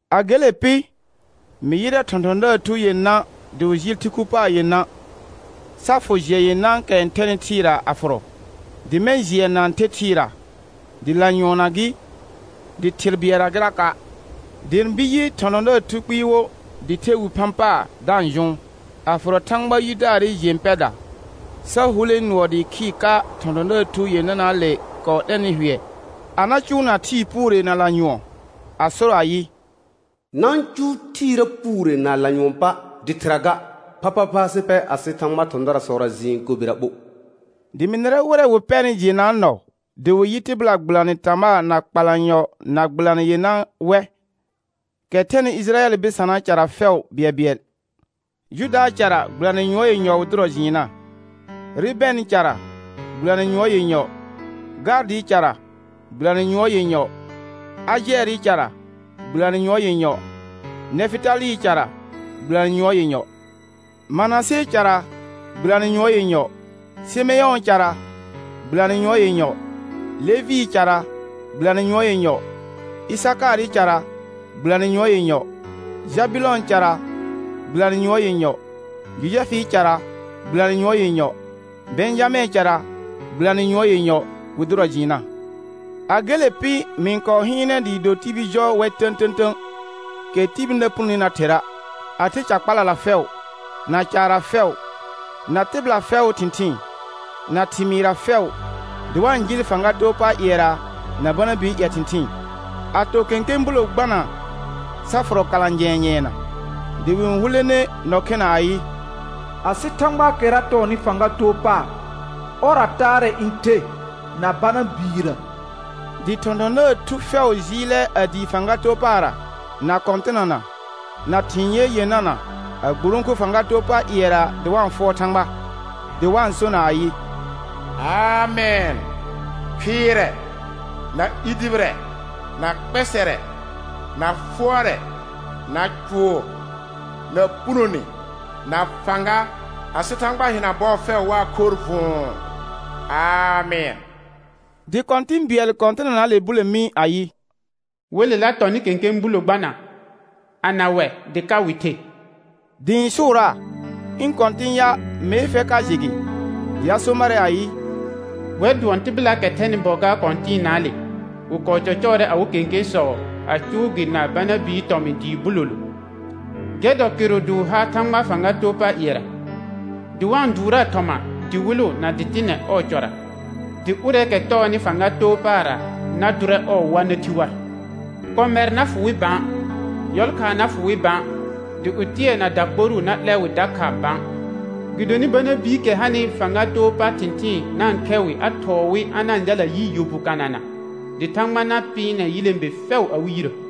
A gele pɩ, mɩ yɩrɛ thɔ̃thɔ̃daar thu yenã dɩ wɩ jɩɩl thɩ khu paar yenã, sa fʋ jɩɛ yenãakɛ n thɛnɩ thɩɩra a fʋrɔ, dɩ mɛ̃ jɩɛ na-n the thɩɩra, dɩ lanyʋɔnna gɩ, dɩ thɩr bɩɛlla gɩraka'. Dɩ ɩ̃ bir yɩ thɔ̃thɔ̃daar thu kpɩɩ wo dɩ the wi phã paar da-n jʋʋn, a fʋrɔ Thãgba yidaarɩ jẽ pɛda sa hulẽ nʋɔ dɩɩ khɩɩr ka thɔ̃thɔ̃daar thu yenanaale kɔɔ 'lɛnɩ hʋɛ a na cʋʋna thɩɩ puure na lanyʋɔn, a so ayɩ: Na-n cʋʋ thɩɩra puure na lanyʋɔn pa', dɩ thɩra ga, phaphapha sɩ pɛ asɩ Thãgbaa thɔ̃darasɔra jɩɩn kobera ɓo. Dɩ mɩ nɩrɛ wɩrɛ wɩ pɛrnɩ jɩɩnnaa nɔ dɩ wɩ yɩ tɩbɩla gbɩlanɩ tamaa na kpalanyɔ na gbɩlanɩ yenã wɛ, kɛ thɛnɩ Ɩjɩrayɛl bɩsanaa cara fɛʋ bɩɛlbɩɛl. Judaa cara, gbɩlanɩ yʋɔr yenyɔ wɩ dʋrɔ jɩɩnna, Rubɛnɩ cara, gbɩlanɩ yʋɔr yenyɔ, Gaadɩɩ cara, gbɩlanɩ yʋɔr yenyɔ, Ajɛɛrɩ cara, gbɩlanɩ yʋɔr yenyɔ, Nɛfɩtalɩɩ cara, gbɩlanɩ yʋɔr yenyɔ, Manasee cara, gbɩlanɩ yʋɔr yenyɔ, Sɩmɛ̃ʋʋ cara, gbɩlanɩ yʋɔr yenyɔ, Levɩɩ cara, gbɩlanɩ yʋɔr yenyɔ, Ɩsakaarɩ cara, gbɩlanɩ yʋɔr yenyɔ, Jabʋlɔ̃ɔ cara, gbɩlanɩ yʋɔr yenyɔ, Jojɛfɩɩ cara, gbɩlanɩ yʋɔr yenyɔ, Bɛ̃jamɛ̃ɛ cara, gbɩlanɩ yʋɔr yenyɔ, wɩ dʋrɔ jɩɩnna. A gele pɩ mɩ-n kɔɔ hɩɩnɛ dɩɩ do tibil jɔ wɛ tə̃tə̃tə̃, kɛ tibil na punoni na thera', a the ca kpalala fɛʋ, na caarra fɛʋ, na tɩbɩla fɛʋʋ thɩ̃thɩɩn, na thɩmɩɩrra fɛʋ, dɩ wa-n jɩɩl fãga too pa ƴɩɛra na Bana bii ƴɛ thɩ̃thɩɩn, a to kẽkẽ bulo gbana sa fʋrɔ kalã jɛ̃ɛ nyɛɛna. Dɩ wɩ-n hulene nɔ khena ayɩ: Asɩ Thãgbaakɛra tɔɔnɩ fãga too paar, ɔrra taarɛ n the na Bana biirə. Dɩ thɔ̃thɔ̃daar thusɔ fɛʋ jɩɩlɛ a dii fãga too paarra, na kɔ̃tɩnana, na thɩ̃ ye yenana, a gburõku fãga too pa ƴɩɛra dɩ wa-n fʋɔr Thãgba, dɩ wa-n sona ayɩ: Amɛn. Khɩɩrɛ, na i dʋbɩrɛ, na kpɛsɛrɛ, na fʋɔrɛ, na cʋʋr, na punone, na fãga, asɩ Thãgba hɩna bɔɔ fɛʋ waa khorr vʋ̃ʋ. Amɛn. Dɩ kɔ̃tɩ̃ bɩɛl kɔ̃tɩnanaale bule mi ayɩ: Welela tɔnɩ kẽkẽ bulo gbana, ana wɛ dɩ ka wɩ the? Dɩ ɩ̃ sʋʋraa: Ɩ̃ kɔ̃tɩ̃ ya mee fɛr ka jɩ gɩ. Dɩ a so marɛ ayɩ: Wɛr dʋɔn tɩbɩlaakɛ thɛnɩ bɔ gaar kɔ̃tɩɩnaale; wɩ kɔɔ cɔcɔɔrɛ awɩ kẽkẽsɔ a cʋʋ gɩ na Bana bii tɔmɩ̃ dɩɩ bulolo. Gɛr dɔ kɩrʋ dɩ wɩ ha Thãgbaa fãga too pa ƴɩɛra, dɩ wa-n dʋʋraa thɔma dɩwɩlʋ na dɩtɩnɛ ɔɔ cɔra; dɩ ʋrɛɛkɛ tɔɔnɩ fãga too paarra na dʋrɛ ɔɔ wa na thi war. Kɔmɛr na fʋ wɩ bã, yɔlkhaa na fʋ wɩ bã, dɩ ɩtʋɛ na dakporuu na 'lɛ wɩ dakha bã. Gɩdonɩ Bana biikɛ hanɩ fãga too pa thɩ̃thɩɩn na-n khɛ wɩ a thɔɔ wɩ a na-n jalna yi yɔ bu kanana, dɩ Thãgba na pɩɩnɛ yilẽbe fɛʋ awɩ yirə.